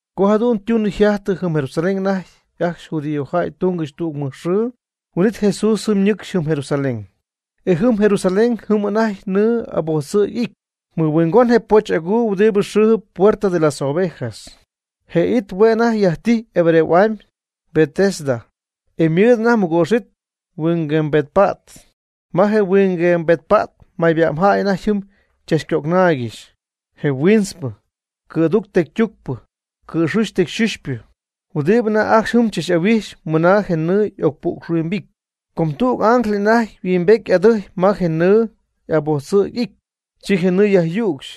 Co jadu'n ytunɨ yjajtɨ jɨm Jerusalén anajty ajcxy judíojäy tungɨxy tüg mɨjxɨɨ. Huin'it Jesús jɨm ñɨcxy jɨm Jerusalén. E jɨm Jerusalén jɨm anajty nɨɨ abojtzɨ̈g y'ity, mɨhuingon je poch aguu huɨdi xɨɨjɨp puerta de las ovejas. Je it hue' anajty yajtijy hebreo'amy Betesda, e ymɨɨd anajty mɨgoox it yhuinguembetpa't. Ma je huinguembetpa't mayba'mjäy anajty jɨm chachcögnaaygɨxy; je huintzpɨ, cɨ̈ducp tecytucpɨ, cɨ̈xuxy tecyxuxypɨ, huɨdibɨ anajty ajcxy jɨm tzach'ahuijxp mɨna je nɨɨ y'ocpu'xhuimbity. Com tüg ángel anajty yhuimbety y'adɨjy ma je nɨɨ abojtzɨ̈g y'ity, chi je nɨɨ yajyücxy.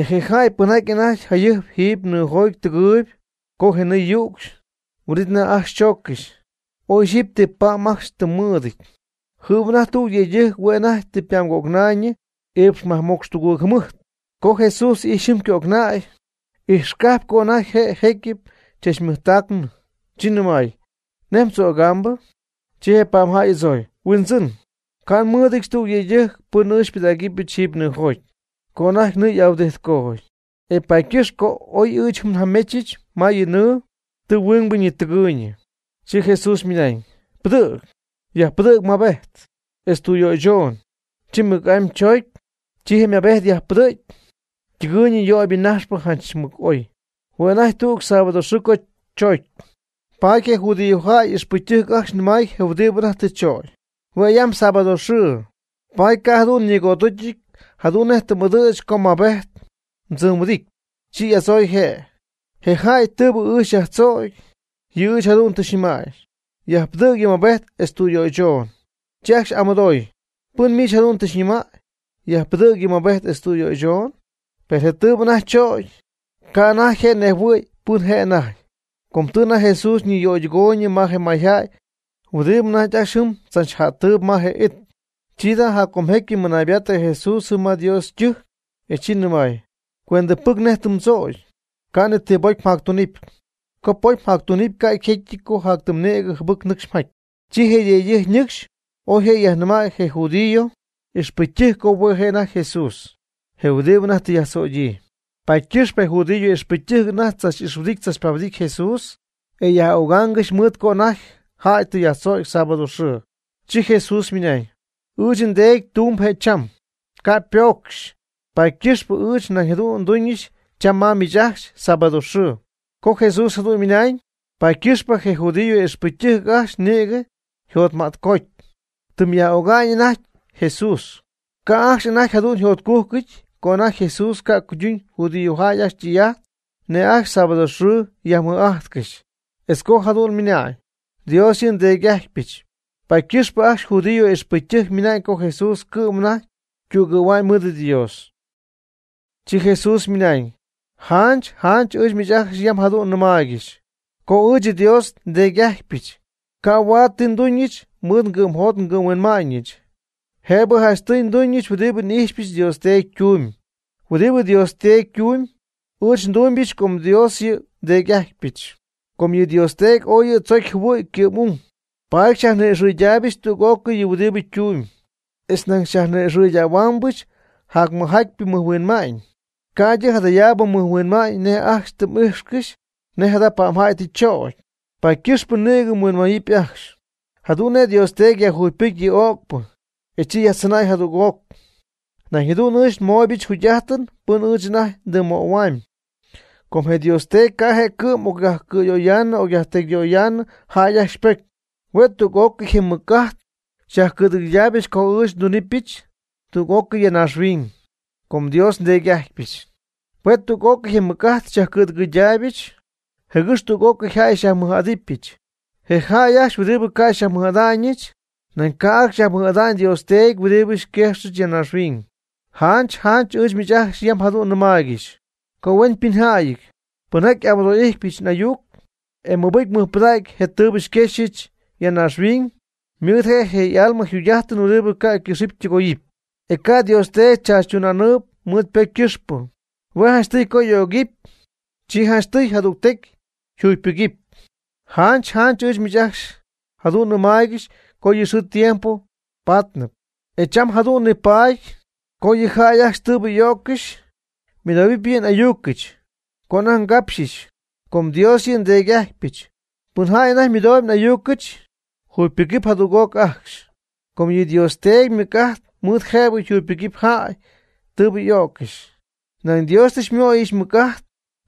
E je jäy pɨnjaty anajty jayɨjp jiiby nɨɨjoty tɨgɨɨyb co je nɨɨ yücxy, huin'it anajty ajcxy chooccɨxy, oy ixyipy ti pa'm ajcxy tɨm mɨɨdɨty. Jɨm anajty tüg yëydɨjc hue' anajty tɨ ypa'mgögnäy iipx majmocx tugɨɨg jɨmɨjt. Co Jesús ijxy jɨm ycögnäy, ijxcajpy co anajty je' jecyɨp chachmɨjtacnɨ, chi nɨmay: ―¿Nej mdzögambɨ? Chi je pa'mjäy y'adzooy: ―Huindzɨn, ca' nmɨɨdɨdyɨch tüg yëydɨjc pɨn ɨɨch xypɨdägɨpy jiiby nɨɨjoty co anajty nɨɨ y'ahuɨdijtcoty. E paady ycɨxpɨ co oy ɨɨch jɨm njamechɨch ma yɨ nɨɨ, tɨ huingbɨ ñitɨgɨɨyñɨ. Chi Jesús ymɨnañ: ―Pɨdɨ̈g, yajpɨdɨ̈g yɨ mmaabejt, etz tüyöychon. Chi mɨc'amy choocy, chi je' ymaabejt yajpɨdɨ̈gy ytɨgɨɨy yöybɨ najxpɨ janch mɨc oy. Hue' anajty tüg sábado xɨɨ co choocy. Paady je judíojäy ixpɨcytɨjc ajcxy nɨmay je huɨdibɨ anajty tɨ chögy: ―Hue' yam sábado xɨɨ, paady ca' jadu'n ñigo'aducyɨty jadu'n nej m'ɨdɨ̈ch co mmaabejt mdzɨmhuɨdity. Chi y'adzooy je': ―Je jäy tɨɨbɨ ɨɨch xyajtzögy, yɨ' ɨɨch jadu'n tɨ xyñɨmäy: “Yajpɨdɨ̈g yɨ mmaabejt etz tüyöychoon.” Chi ajcxy y'amɨdooy: ―¿Pɨn miich jadu'n tɨ xyñɨmäy: “Yajpɨdɨ̈ yɨ mmaabejt etz tüyöychoon”? Per je tɨɨbɨ anajty chögy, ca' anajty je' nejhuɨ̈y pɨn je' anajty. Com tɨ anajty Jesús niyöydɨgooyñɨ ma je mayjäy huɨdibɨ anajty ajcxy jɨm tzachjajtɨp ma je it. Chi jada' jaccomjecy mɨnaybaattɨ Jesús jɨm ma Dios ytɨjc, e chi Jesús ymɨnañ: ―Cuentɨpɨc nej tɨ mdzögy, ca' ni ti bocy mjactunɨpy. Co pocy mjactunɨpy ca' yjecyɨty co tɨm nïgɨ jɨbɨc nɨcxy mjaty. Chi je yëydɨjc ñɨcxy oy je' yajnɨmäy je judío ixpɨcytɨjc co hue' je' anajty Jesús, je huɨdibɨ anajty tɨ yajtzögyii. Paady ycɨxpɨ je judío ixpɨcytɨjc anajty tzach'ixhuɨdijtcɨxy tzachpahuɨdijtcɨxy je Jesús, e yaj'ögaangɨxy mɨɨd co anajty jäy tɨ yajtzögy sábado xɨɨ. Chi Jesús ymɨnañ: ―Ɨɨch nDeedy tumb je' cham, ca' ypoocxy, paady ycɨxp ɨɨch nañ jadu'n nduñɨch cham ma miich ajcxy sábado xɨɨ. Co Jesús jadu'n ymɨnañ, paady ycɨxpɨ je judío y'ixpɨcytɨjc ajcxy nïgɨ yjacjtotma'tcoty, ytɨmy yaj'ögamy anajty aj y Jesús. Ca' ajcxy jadu'n yjotcujcɨty co anajty Jesús ca' cuyduñ judíojäy ajcxy ytɨy'ajt nej ajcxy sábado xɨɨ yajmɨj'ajtcɨxy, etz co jadu'n ymɨnañ: “Dios yɨ' nDeedy'ajtypɨch.” Paady ycɨxpɨ ajcxy judío y'ixpɨcytɨjc ymɨnañ co Jesús cɨ'm anajty ytügɨ̈hua'ñ mɨɨd Dios. Chi Jesús ymɨnañ: ―Janch janch ɨɨch miich ajcxy yam jadu'n nɨmaaygɨxy co ɨɨch Dios nDeedy'ajtypɨch. Ca' huaad ti nduñɨch mɨɨd ngɨ'mjot ngɨ'mhuinma'ñɨch. Jëbɨ janchtɨy nduñɨch huɨdibɨ n'ijxpyɨch Dios Teedy ytumy. Huɨdibɨ Dios Teedy ytumyb, ndumybɨch com Dios yɨ' nDeedy'ajtypɨch. Com yɨ Dios Teedy ooy yɨ tzocy jɨhuɨ̈ ycɨ'm'ung, paady xyajni'ixɨydaaybɨch tüg'ócɨy yɨ huɨdibɨ ytumyb. E nañ xyajni'ixɨ̈huaambɨch jacmɨjjatypɨ mɨjhuinma'ñ, ca'ydɨ jadayaabɨ mɨjhuinma'ñ nej ajcxy tɨ m'ijxycɨxy nej jada pa'mjäy tɨ chögy, paady ycɨxpɨ nïgɨ mhuinmayɨpy ajcxy. Jadu'n nej Dios Teedy yajjugypɨcy yɨ o'cpɨ, e chi yajtzɨnäy jadüg'oc. Nañ jadu'n ɨɨch anajty ndɨmymöhuamyb. Com je Dios Teedy ca' je' cɨ'm ocyajcɨ̈yöyaanɨ ocyajtecyyöyaanɨ jäy ajcxy ypocy. Hue' tüg'ócɨy je ymɨc'ajt xyajcɨ̈dɨgɨydaayɨch co ɨɨch ndɨydunɨpyɨch tüg'ócɨy naaxhuiñyjäy, com Dios nDeedy'ajtypɨch. Hue' tüg'ócɨy je ymɨc'ajt xyajcɨ̈dɨgɨydaayɨch, jɨgɨx tüg'ócɨy jäy xyajmɨj'adɨpyɨch. Je jäy ajcxy huɨdibɨ ca' xyajmɨj'ada'ñɨch, nañ ca' ajcxy yajmɨj'ada'ñ Dios Teedy huɨdibɨ xyquejxɨch ya naaxhuiñ. Janch janch ɨɨch miich ajcxy yam jadu'n nɨmaaygɨxy: Co hueñypɨnjäyɨty, pɨnjaty xy'amɨdo'íjtɨbɨch n'ayuc, e ymɨbɨjcyp ymɨjpɨdacyp je tɨɨbɨ xyquejxyɨch ya naaxhuiñ, ymɨɨd je'je y'alma jugy'ajtɨn huɨdibɨ ca'ycɨxɨpy ytɨgoyɨpy, e ca' Dios Teedy chaachytuna'ñyii mɨɨd ypocy ycɨxpɨ. Hue' janchtɨy co y'ögɨpy, chi janchtɨy jadügtecy yjugypɨgɨpy. Janch janch ɨɨch miich ajcxy jadu'n nɨmaaygɨxy co yɨ xɨɨ tiempo paatnɨpy, e cham jëdu'n tɨ paady, co yɨ jäy ajcxy tɨɨbɨ y'o'ccɨxy ymɨdohuɨpy yɨ n'ayucɨch, co anajty ngapxyɨch, com Dios yɨ nDeedy'ajtpyɨch. Pɨn jäy anajty mɨdoob n'ayucɨch jugypɨgɨp jadüg'oc ajcxy. Com yɨ Dios Teedy mɨc'ajt mɨɨd jëbɨ yajjugypɨcy jäy tɨɨbɨ y'o'ccɨxy. Nañ Dios tɨ xymöyɨch ymɨc'ajt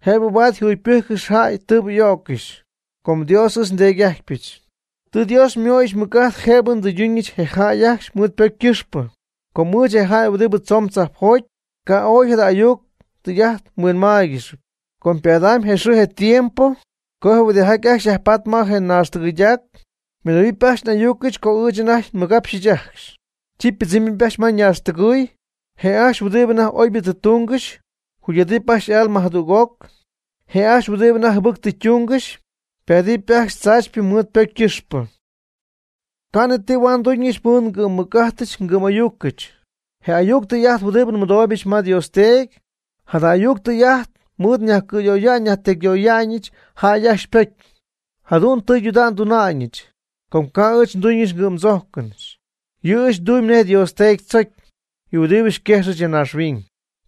jëbɨ huaad nyajjugypɨcyɨch jäy tɨɨbɨ y'o'ccɨxy, com Dios ɨɨch nDeedy'ajtypɨch. Tɨ Dios xymöyɨch ymɨc'ajt jëbɨ ndɨyduñɨch je jäy ajcxy mɨɨd ypocy ycɨxpɨ, com ɨɨch je' je jäy huɨdibɨ tzoon tzajpjoty. Ca' ooy jada ayuc tɨy'ajt mhuinmaaygɨxy. Com ypaadɨpy je xɨɨ je tiempo co je huɨdijaty ajcxy yajpatp ma naaxtɨgɨydac, ymɨdohuɨpy ajcxy n'ayucɨch co ɨɨch anajty nmɨgapxyɨch ajcxy. Chi ypɨdzɨmɨpy ajcxy ma ñaaxtɨgɨy. Je' ajcxy huɨdibɨ anajty oybɨ tɨ tungɨxy, jugy'adɨp ajcxy y'alma jadüg'oc. Je' ajcxy huɨdibɨ anajty jɨbɨcpɨ tɨ tungɨxy ypaadɨpy ajcxy tzaachypɨ mɨɨd ypocy ycɨxpɨ. Ca' ni ti huaad nduñɨch mɨɨd ngɨ'mmɨc'ajtɨch ngɨ'm'ayucɨch. Je ayuc tɨy'ajt huɨdibɨ nmɨdooybɨch ma Dios Teedy, jada ayuc tɨy'ajt mɨɨd nyajcɨ̈yöya'ñɨch nyajtecyyöya'ñɨch jäy ajcxy ypocy. Jadu'n tɨydudägy nduna'ñɨch, com ca' ɨɨch nduñɨch ngɨ'mdzójcɨnɨch. Yɨ' ɨɨch ndumyb nej Dios Teedy tzocy, yɨ huɨdibɨ xyquejxɨch ya naaxhuiñ.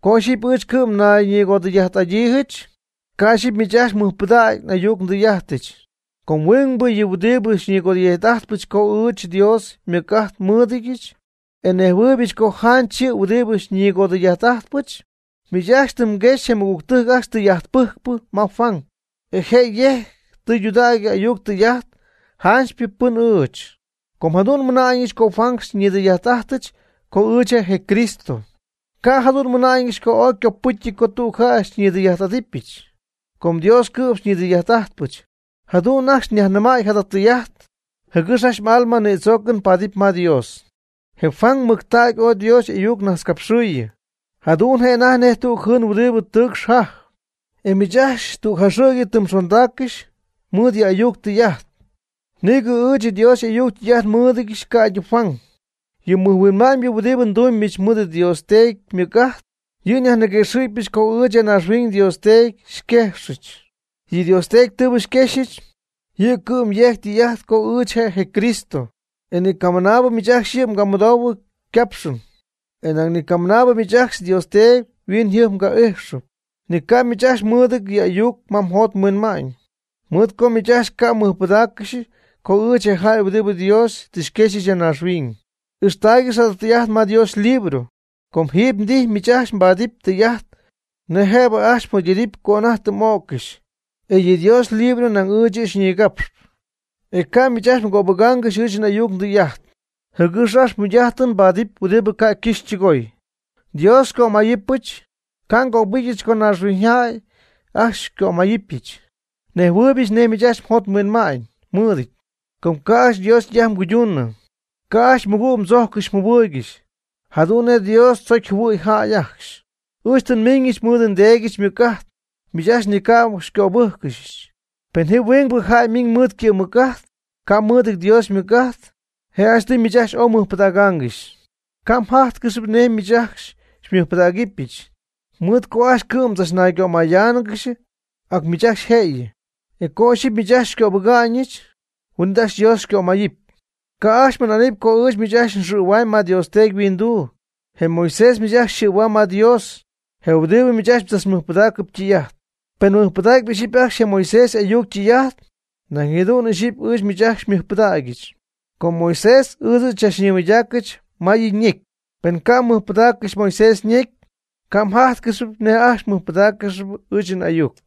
Co ixyipy ɨɨch cɨ'm nayñigodɨy'ajt'adyiijɨch, ca' ixyipy miich ajcxy mmɨjpɨdägy n'ayuc ndɨy'ajtɨch. Com huingbɨ yɨ' huɨdi xyñigodɨy'ajt'ajtpɨch co ɨɨch Dios ymɨc'ajt nmɨɨdɨdyɨch, e nejhuɨɨybɨch co janch yɨ' huɨdibɨ xyñigodɨy'ajt'ajtpɨch. Miich ajcxy tɨ mguexy je mɨgügtɨjc ajcxy tɨy'ajtpɨjcpɨ ma Juan. E je' yejc tɨydudägy ayuc tɨy'ajt janchypɨ pɨn ɨɨch. Co jadu'n nmɨna'ñɨch co Juan xyajnidɨy'ajt'atyɨch co ɨɨch je' je Cristo, ca' jadu'n nmɨna'ñɨch co ooy ycopɨcyɨty co tüg jäy xyñidɨy'ajt'adɨpyɨch. Com Dios cɨ'm xyñidɨy'ajt'ajtpɨch. Jadu'n ajcxy nyajnɨmäy jada tɨy'ajt, jɨgɨx ajcxy m'alma nïdzoocɨn paadɨpy ma Dios. Je Juan mɨctägy ooy Dios y'ayuc najtzcapxiɨyɨ, jadu'n je' anajty nej tüg jɨɨn huɨdibɨ tɨɨcxp jajp, e miich ajcxy tüg jaxɨ̈gyɨ tɨ mxondaaccɨxy mɨɨd yɨ' y'ayuc ytɨy'ajt. Nïgɨ ɨɨch Dios y'ayuc ytɨy'ajt nmɨɨdɨdyɨch ca'ydɨ Juan. Yɨ mɨjhuinma'ñ huɨdibɨ ndumybɨch mɨɨd Dios Teedy ymɨc'ajt. yɨ' xyajniguëxɨ̈gɨbɨch co ɨɨch ya naaxhuiñ Dios Teedy xyquejxɨch. Yɨ Dios Teedy tɨɨbɨ xyquexyɨch, yɨ' cɨ'm yejc tɨy'ajt co ɨɨch je' je Cristo. E ni camɨnaabi miich ajcxy yɨ' mgamɨdoohuɨ ycapxɨn, nañ ni camɨnaabɨ miich ajcxy Dios Teedy yhuiñyjɨjp maga'ijxɨ. Ni ca' miich ajcxy mmɨɨdɨty yɨ' y'ayuc ma mjot mhuinma'ñ, mɨɨd co miich ajcxy ca' xymɨjpɨdägyɨch co ɨɨch je' je jäy huɨdibɨ Dios tɨ quexy ya naaxhuiñ. Ijxtaaygɨxy jada tɨy'ajt ma Dios ylibro, com jiiby mdijy miich ajcxy mbaadɨpy tɨy'ajt nej jëbɨ ajcxy mjugy'adɨpy co anajty tɨ m'o'ccɨxy, e yɨ Dios ylibro nañ ɨɨch yɨ' xyñigapxp. E ca' miich ajcxy mgöbɨgaangɨxy ɨɨch n'ayuc ɨɨch ndɨy'ajt, jɨgɨx ajcxy jugy'ajtɨ mbaadɨpy huɨdibɨ ca' ycɨxy ytɨgooy. Dios xycömayɨpyɨch, ca' ngöbɨgɨpyɨch co naaxhuiñyjäy ajcxy xycömayɨpyɨch. Nnejhuɨɨybɨch, nej miich ajcxy mjot mhuinma'ñ mmɨɨdɨty, co ca' ajcxy Dios ytɨy'ajt mguyduunɨ. Ca' ajcxy mɨgüg mdzojccɨxy mjɨhuɨɨygɨxy jadu'n nej Dios tzocy jɨhuɨ̈y jäy ajcxy. Ɨɨch tɨ nmiiñɨch mɨɨd nDeedyɨch ymɨc'ajt. Miich ajcxy ni ca' xycöbɨcyɨch. Pen ji huingbɨ jäy ymiiñ mɨɨd ycɨ'mmɨc'ajt, ca' mɨɨdɨty Dios ymɨc'ajt, je' janchtɨy miich ajcxy ooy mɨjpɨdägaangɨxy. Ca' mjájtcɨxɨpy nej ɨɨch miich ajcxy xymɨjpɨdägɨbɨch, mɨɨd co ajcxy cɨ'm mdzachnaygömayáanɨgɨxy ac miich ajcxy jëyɨ. E co ixyipy miich ajcxy xycöbɨga'ñɨch, huin'it ajcxy Dios xycömayɨpy. Ca ajcxy mmɨna'nɨpy co ɨɨch miich ajcxy nxɨ̈huaamy ma Dios Teedy yhuinduu. Je Moisés miich ajcxy yxɨ̈huam ma Dios, je huɨdibɨ miich ajcxy mdzachmɨjpɨdaacɨp ytɨy'ajt. Pen mmɨjpɨdaacyp ixyipy ajcxy je Moisés y'ayuc ytɨy'ajt, nañ jadu'n ixyipy ɨɨch miich ajcxy xymɨjpɨdägyɨch. Com Moiseś ɨɨch yɨ' xychachñimɨydaacɨch ma yɨ' ñecy. Pen ca' mmɨjpɨdaaccɨxy Moiseś ñecy, ca' mjájtcɨxɨpy nej ajcxy mɨjpɨdáaccɨxɨpy ɨɨch n'ayuc.